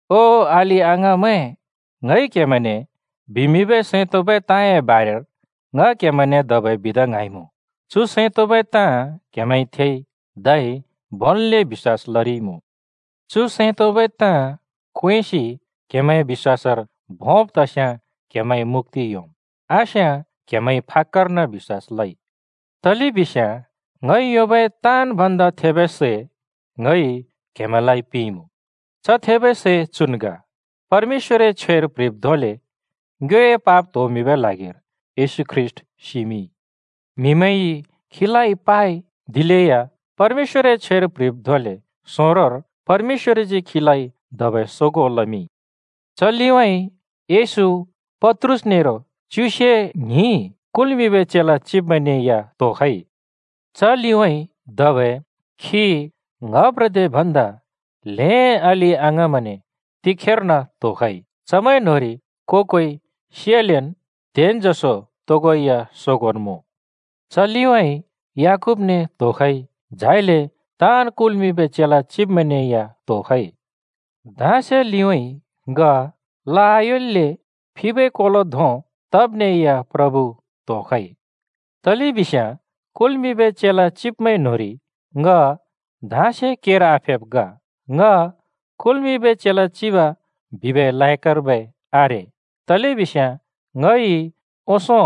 ओ अलि-अङाँमैं, ङइ क्हेमैंने बिमिंबै सैं तोंबै ताँए बारेर ङ क्‍हेमैंने धबै बिदा ङ्हाँइमुँ। चु सैं तोंबै ताँ क्‍हेमैंइ थेइ, धै भोंन्‍ले बिश्‍वास लरिइमुँ। चु सैं तोंबै ताँ क्वेंसि क्हेमैं बिश्‍वासर भोंब् तस्याँ क्‍हेमैंइ मुक्‍ति योंम्। आस्‍याँ क्‍हेमैंइ फाक्‍कर्न बिश्‍वास लइ। तलेबिस्याँ ङइ योंबै ताँन् भन्दा थेबै सै ङइ क्‍हेमैंलाइ पिंइमुँ। च थेबै सै चुन् ग: परमेश्‍वरए छ्वेर प्‍ह्रिब् धोंले ङ्योए पाप त्होमिंबै ल्हागिर येशू ख्रीष्‍ट सिमिंइ। म्‍हिमैंइ खीलाइ पाइ, दिलेया परमेश्‍वरए छ्वेर प्‍ह्रिब् धोंले सोंरोर परमेश्‍वरजी खीलाइ धबै सोगों लमिंइ। च लिउँइँ येशू पत्रुस नेरो च्युसे ङ्हिं कुल्मिंबै चेला चिब्मैंने या त्‍होखइ। च लिउँइँ धबै खी ङ्‌हप्रदे भन्दा ल्हें अलि-अङाँमैंने तिखेर्न त्‍होखइ। चमैं न्होंरि को-कोइ सियालेन् त्हेन् जसो तोगोइ या सोगोंन् मुँ। च लिउँइँ याकूबने त्‍होखइ, झाइले ताँन् कुल्मिंबै चेला चिबमैंने या त्‍होखइ। धाँसे लिउँइँ ङ ला आयोल्‍ले फिबै कोलो धों तब्ने या प्रभु त्‍होखइ। तलेबिस्याँ कुल्मिंबै चेला चिब्मैं न्‍होंरि ङ धाँसे केर आफेब् ग। ङ कुल्मिंबै चेला चिब बिबै लायकर्बै आरे, तलेबिस्याँ ङइ ओंसों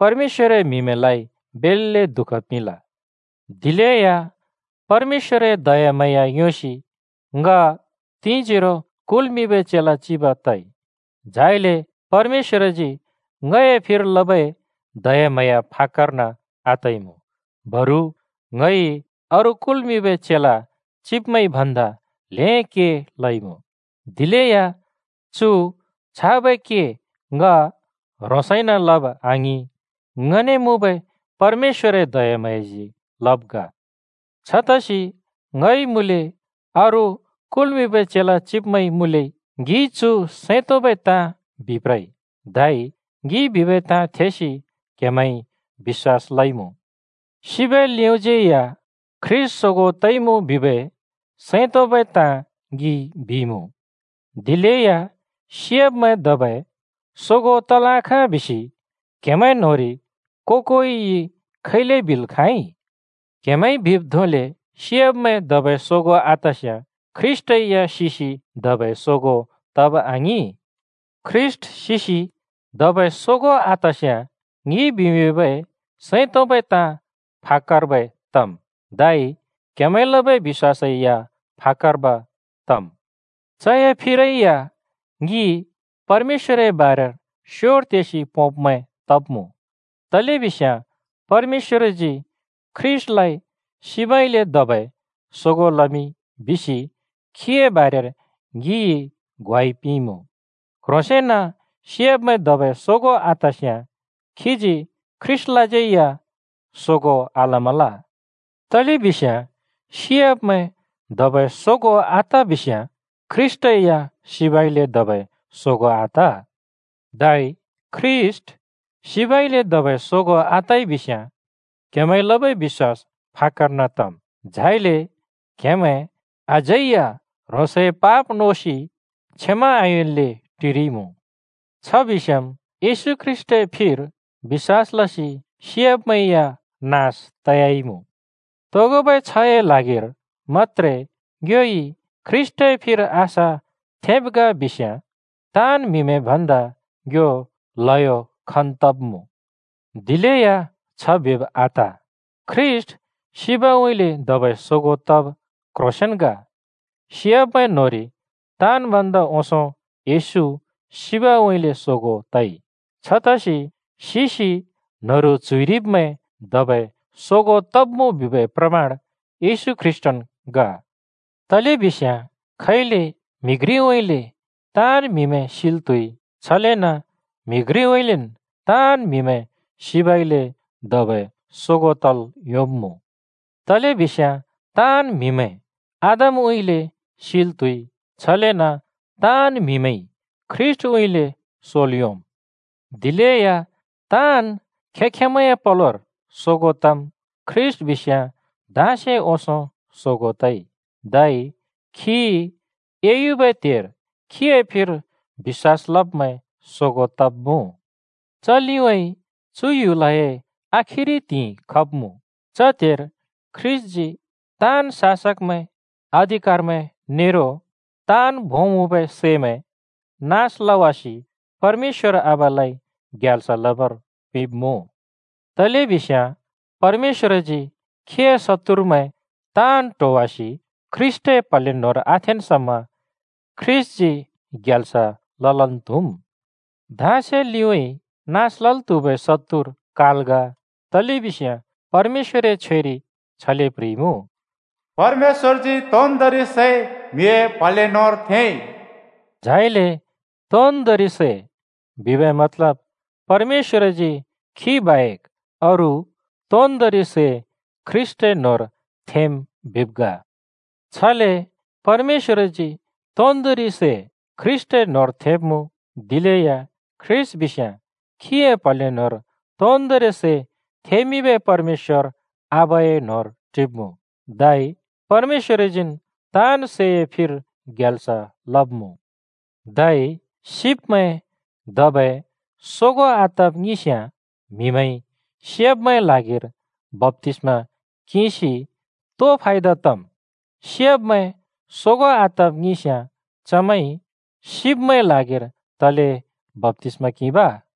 परमेश्‍वरए म्‍हिमैंलाइ बेल्‍ले दुःख पिंल। दिलेया परमेश्‍वरए दयाम्हाँया योंसि ङ तिंजोरो कुल्मिंबै चेला चिब तइ। झाइले परमेश्‍वरजी ङए फिर लबै दयाम्हाँया फाक्‍कर्बै आतइमुँ, बरु ङइ अरू कुल्मिंबै चेला चिब्मैंइ भन्दा ल्हें के लइमुँ। दिलेया चु छाबै के ङ ह्रोंसैन लब आङिं, ङने मुँबै परमेश्‍वरए दयाम्हाँयाजी लब् ग। छतसि ङइ मुँले अरू कुल्मिंबै चेला चिब्मैंइ मुँले, ङिइ चु सैं तोंबै ताँ बिप्रइ, धै ङिइ बिबै ताँ थेसि क्‍हेमैंइ बिश्‍वास लइमुँ। सिबै लिउँइँज्यै या ख्रीष्‍ट सोगों तइमुँ बिबै सैं तोंबै ताँ ङिइ बिइमुँ। दिलेया सियाब्‍मैं धबै सोगों तल् आखाँ बिसि क्‍हेमैं न्‍होंरि को-कोइइ खैले बिल् खाँइ? क्‍हेमैंइ बिब् धोंले सियाब्‍मैं धबै सोगों आतस्याँ ख्रीष्‍टै या सिसि धबै सोगों तब आङिं। ख्रीष्‍ट सिसि धबै सोगों आतस्याँ ङिइ बिमिंबै सैं तोंबै ताँ फाक्‍कर्बै तम्, धै क्‍हेमैंइ लबै बिश्‍वासै या फाक्‍कर्ब तम्। चए फिरै या ङि परमेश्‍वरए बारेर स्योर तेसि पोंब्मैं तब्मुँ, तलेबिस्याँ परमेश्‍वरजी “ख्रीष्‍टलाइ सिबउँइँले धबै सोगों लमिंइ” बिसि खीए बारेर ङिइ ग्वाइ पिंइमुँ। क्ह्रोसेंन सियाब्मैं धबै सोगों आतस्याँ खीजी ख्रीष्‍टलाज्यै या सोगों आलमल। तलेबिस्याँ सियाब्मैं धबै सोगों आत बिस्याँ ख्रीष्‍ट या सिबउँइँले धबै सोगों आत। धै ख्रीष्‍ट सिबउँइँले धबै सोगों आतइ बिस्‍याँ क्‍हेमैंइ लबै बिश्‍वास फाक्‍कर्न तम्, झाइले क्‍हेमैं अझै या ह्रोंसए पाप नोसि क्षमा आयोंन्‍ले टिरिइमुँ। छ बिस्याँम् येशू ख्रीष्‍टए फिर बिश्‍वास लसि सियाब्मैं या नास तयाइमुँ। तोगोबै छ्हए ल्हागिर मत्‍त्रे ङ्योइ ख्रीष्‍टए फिर आशा थेंब् ग बिस्याँ ताँन् म्‍हिमैं भन्दा ङ्यो ल्‍हयो खन् तब्मुँ। दिलेया छ बिब आत! ख्रीष्‍ट सिबउँइँले धबै सोगों तब क्‍ह्रोसेंन् ग। सियाब्‍मैं न्‍होंरि ताँन् भन्दा ओंसों येशू सिबउँइँले सोगों तइ। छतसि सिसि न्‍हरु च्‍हुइरिब्‍मैं धबै सोगों तब्मुँ बिबै प्रमाण येशू ख्रीष्‍टन् ग। तलेबिस्याँ खैले म्‍हि घ्रिउँइँले ताँन् म्हिमैं सिल् त्‍हुइ, छलेन म्‍हि घ्रिउँइँलेन् ताँन् म्‍हिमैं सिबउँइँले धबै सोगों तल् योंब्मुँ। तलेबिस्याँ ताँन् म्‍हिमैं आदमउँइँले सिल् त्‍हुइ, छलेन ताँन् म्हिमैंइ ख्रीष्‍टउँइँले सोल् योंम्। दिलेया ताँन् खें-खेंमैंए पलोर सोगों तम्। ख्रीष्‍ट बिस्याँ धाँसे ओंसों सोगों तइ, धै खी एयुबै त्हेर खीए फिर बिश्‍वास लब्मैं सोगों तब्‍मुँ। च लिउँइँ चु ह्‍युलए आखिरि त्हिंइ खब्‍मुँ। च त्हेर ख्रीष्‍टजी ताँन् शासकमैं, अधिकारमैं नेरो ताँन् भों मुँबै सैमैं नास लवासि परमेश्‍वर आबालाइ ग्याल्स लबर पिंब्मुँ। तलेबिस्याँ परमेश्‍वरजी खीए शत्तुरमैं ताँन् ट्होवासि ख्रीष्‍टए प्‍हले न्‍होंर आथेंन् समा ख्रीष्‍टजी ग्याल्स ललन् त्‍हुम्। धाँसे लिउँइँ नास लल् त्हुबै शत्तुर काल ग। तलेबिस्याँ परमेश्‍वरए छ्वेरि छले प्‍ह्रिइमुँ, “परमेश्‍वरजी तोन्दोंरि सै म्‍हिए प्‍हले न्‍होंर थेंइ।” झाइले “तोन्दोंरि सै” बिबै मतलब परमेश्‍वरजी खी बाहेक अरू तोन्दोंरि सै ख्रीष्‍टए न्होंर थेंम् बिब् ग। छले परमेश्‍वरजी तोन्दोंरि सै ख्रीष्‍टए न्होंर थेंब्मुँ, दिलेया ख्रीष्‍ट बिस्याँ खीए प्हले न्होंर तोन्दोंरि सै थें‍मिंबै परमेश्‍वर आबाए न्होंर टिब्‍मुँ, धै परमेश्‍वरजीन् ताँन् सैए फिर ग्याल्स लब्‍मुँ। धै सिब्‍मैं धबै सोगों आतब् ङिंस्‍याँ म्‍हिमैंइ सियाब्‍मैंए ल्हागिर बप्‍तिस्‍मा किंसि तो फायदा तम्? सिब्‍मैं सोगों आतब् ङिंस्‍याँ चमैंइ सिब्‍मैंए ल्हागिर तले बप्‍तिस्‍मा किंब?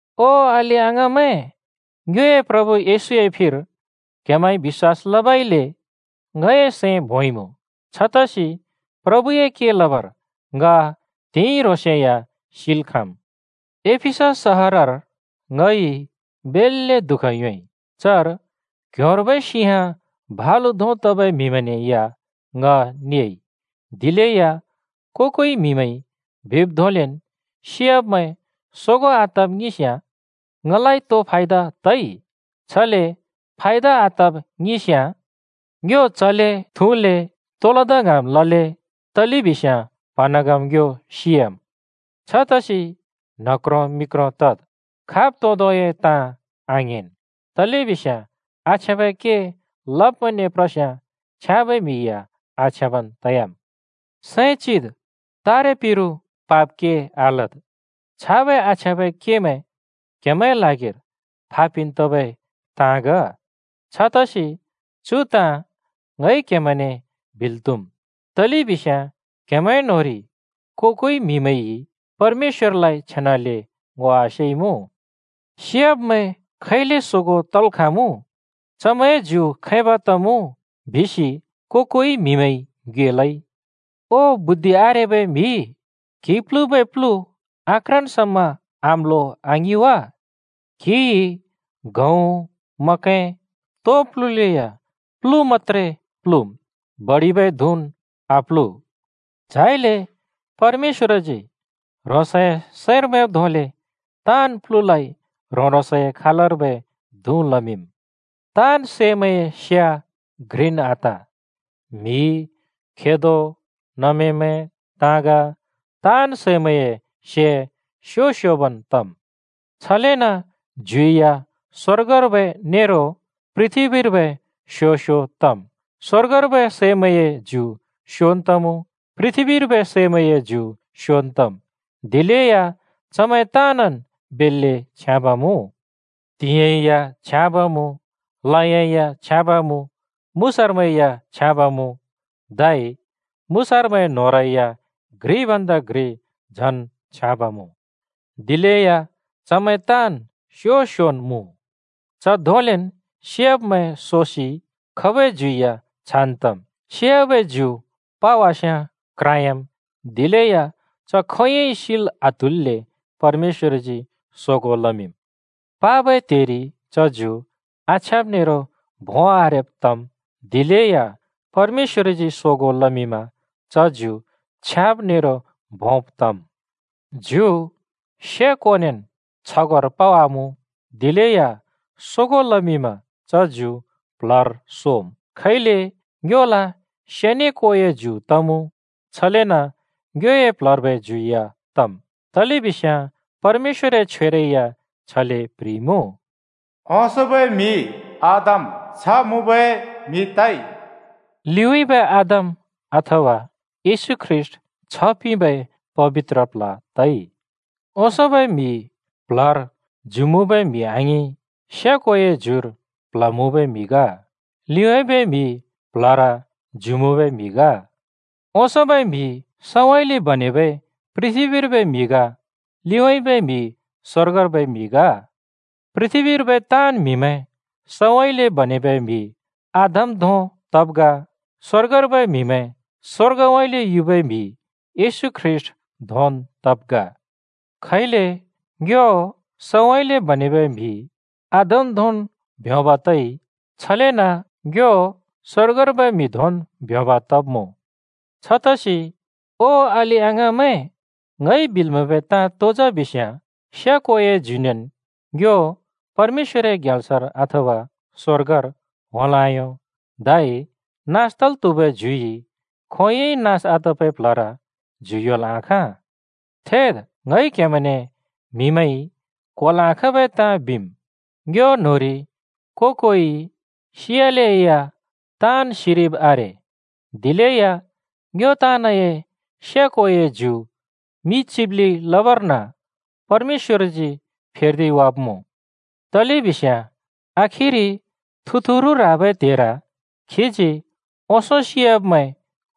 ओ अलि-अङाँमैं, ङ्योए प्रभु येशूए फिर क्हेमैंइ बिश्‍वास लबइले ङए सैं भोंइमुँ। छतसि प्रभुए के लबर ङ त्हिंइ ह्रोंसे या सिल् खाँम्। एफिसस सहरर ङइ बेल्‍ले दुःख योंइ - चर क्ह्‍योंर्बै सिंह भलु धों तबै म्हिमैंने या ङ नेइ। दिलेया को-कोइ म्हिमैंइ बिब् धोंलेन् सियाब्मैं सोगों आतब् ङिंस्‍याँ ङलाइ तो फायदा तइ? छले फायदा आतब् ङिंस्याँ, “ङ्यो चले, थुँले, तो लदा ङ्हाँम् लले, तलेबिस्याँ प्‍हँन्हाँगम् ङ्यो सियाम्।” छतसि न्ह क्रों मि क्रों तद्, खाब तोदोंए ताँ आङेंन्। तलेबिस्याँ “आछ्याँबै के लब्मैंने प्रस्याँ छ्याँबै म्हि या आछ्याँबन् तयाम्।” सैं चित्, तारे पिरु पाप के आलद्। छाबै आछ्याँबै केमैं क्‍हेमैंए ल्हागिर फापिन् तबै ताँ ग। छतसि चु ताँ ङइ क्हेमैंने बिल् त्हुम्, तलेबिस्याँ क्‍हेमैंए न्‍होंरि को-कोइ म्हिमैंइ परमेश्‍वरलाइ छेनाले ङो आसेइमुँ। “सियाब्मैं खैले सोगों तल् खाँमुँ? चमैंए ज्यु खैब तमुँ?” बिसि को-कोइ म्‍हिमैंइ ङ्योएलै। ओ बुद्धि आरेबै म्‍हि, क्हिइ प्‍लुबै प्लु आक्राँन् समा आम्‍लो आङिं वा? क्हिइ गहुँ, मखैं, तो प्‍लुलेया प्लु मत्‍‍त्रे प्‍लुम्, बडिबै धुँन् आप्‍लु। झाइले परमेश्‍वरजी ह्रोंसए सैंर मैंब् धोंले ताँन् प्‍लुलाइ ह्रों-ह्रोंसए खालर्बै धुँ लमिंम्। ताँन् सैमैंए से घ्रिन् आत। म्‍हि, खेदो, नमेमैं, ताँग, ताँन् सैमैंए से स्‍यो-स्‍योबन् तम्। छलेन ज्यु या स्‍वर्गर्बै नेरो पृथ्‍बीर्बै स्यो स्यो तम्। स्‍वर्गर्बै सैमैंए ज्यु स्‍योन् तमुँ, पृथ्‍बीर्बै सैमैंए ज्यु स्योन् तम्। दिलेया चमैं ताँनन् बेल्‍ले छ्याँब् मुँ। त्‍हिंयाँ या छ्याँब मुँ, लयाँ या छ्याँब मुँ, मुसारमैं या छ्याँब मुँ। धै मुसारमैंए न्होंरै या घ्रि भन्दा घ्रि झन छ्याँब मुँ। दिलेया चमैं ताँन् स्यो-स्योन् मुँ। च धोंलेन् सियाब्‍मैं सोसि खबै ज्यु या छान् तम्। सियाबै ज्यु पावास्‍याँ क्राँह्‍याम्, दिलेया च खोंयोंइ सिल् आत्हुल्‍ले परमेश्‍वरजी सोगों लमिंम्। पाबै त्हेरि च ज्यु आछ्याँब नेरो भों आरेब् तम्, दिलेया परमेश्‍वरजी सोगों लमिंमा च ज्यु छ्याँब नेरो भोंब तम्। ज्यु से-कोनेन् छगोंर पावामुँ, दिलेया सोगों लमिंमा च ज्यु प्ल्हर सोम्। खैले ङ्योल से ने कोए ज्यु तमुँ, छलेन ङ्योए प्ल्हर्बै ज्यु या तम्। तलेबिस्याँ परमेश्‍वरए छ्वेरै या छले प्ह्रिइमुँ, “ओंसोंबै म्‍हि आदम छ्ह मुँबै म्‍हि तइ।” लिउँइँबै आदम (अथवा येशू ख्रीष्‍ट) छ्ह पिंबै पबित्र प्ल्ह तइ। ओंसोंबै म्हि प्ल्हर ज्यु मुँबै म्हि आङिं, से-कोए ज्युर प्ल्ह मुँबै म्हि ग। लिउँइँबै म्हि प्ल्हर ज्यु मुँबै म्हि ग। ओंसोंबै म्‍हि सउँइँले बनेबै पृथ्‍बीर्बै म्हि ग, लिउँइँबै म्हि स्‍वर्गर्बै म्हि ग। पृथ्‍बीर्बै ताँन् म्‍हिमैं सउँइँले बनेबै म्‍हि आदम धों तब् ग। स्‍वर्गर्बै म्हिमैं स्‍वर्गउँइँले युबै म्हि येशू ख्रीष्‍ट धोंन् तब् ग। खैले ङ्यो सउँइँले बनेबै म्हि आदम धोंन् ब्योंब् तइ, छलेन ङ्यो स्‍वर्गर्बै म्हि धोंन् ब्योंब् तब्‍मुँ। छतसि ओ अलि-अङाँमैं, ङइ बिल् म्हैबै ताँ तो जा बिस्याँ, से कोए ज्युनेन् ङ्यो परमेश्‍वरए ग्याल्सर, अथवा स्‍वर्गर, होंल् आयों। धै नास तल् त्‍हुबै ज्युइ खोंयोंइ नास आतबै प्ल्हर ज्यु योंल् आखाँ। थेद्, ङइ क्‍हेमैंने म्हिमैंइ क्होल् आखाँबै ताँ बिम्। ङ्यो न्होंरि को-कोइ सियालेया ताँन् सिरिब् आरे, दिलेया ङ्यो ताँनए से-कोए ज्यु मि चिब्‍लि लबर्न परमेश्‍वरजी फेर्दिवाब्‍मुँ। तलेबिस्याँ आखिरि थुतुरु ह्राबै त्हेर खीजी ओंसों सियाब्‍मैं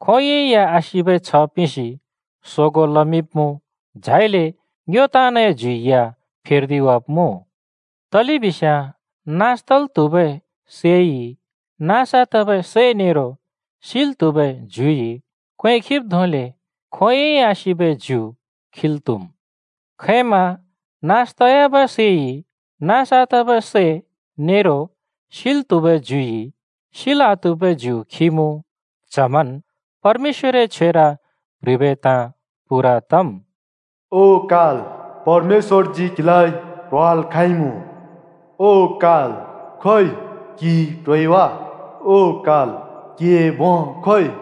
खोंयोंइ या आसिबै छ्ह पिंसि सोगों लमिंब्‍मुँ, झाइले ङ्यो ताँनए ज्यु या फेर्दिवाब्‍मुँ। तलेबिस्याँ नास तल् त्हुबै सैइ नास आतबै सै नेरो सिल् त्हुबै ज्युइ क्वें खिब् धोंले खोंयोंइ आसिबै ज्यु खिल् त्‍हुम्। खैम नास तयाबै सैइ नास आतबै सै नेरो सिल् त्हुबै ज्युइ सिल् आत्हुबै ज्यु खिमुँ, च्हमन् परमेश्‍वरए छ्वेर प्‍ह्रिबै ताँ पूरा तम्, “ओ काल, परमेश्‍वरजी क्हिलाइ ट्होवाल् खाँइमुँ!” “ओ काल, खोइ! क्‍हिइ ट्होइ वा? ओ काल, क्‍हिए भों खोइ?”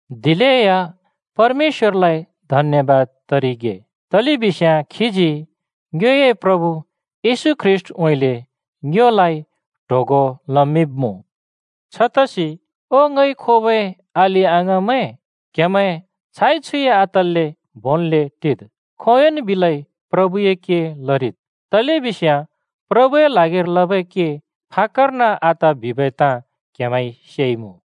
दिलेया परमेश्‍वरलाइ धन्‍यबाद तरिगे, तलेबिस्याँ खीजी ङ्योए प्रभु येशू ख्रीष्‍टउँइँले ङ्योलाइ ट्होगों लमिंब्मुँ। छतसि ओ ङइ खोबै अलि-अङाँमैं, क्हेमैं छाइ-छुइ आतल्‍ले भोंन्ले टिद्। खोंयोंन् बिलै प्रभुए के लरिद्। तलेबिस्याँ प्रभुए ल्हागिर लबै के फाक्‍कर्न आत बिबै ताँ क्‍हेमैंइ सेइमुँ।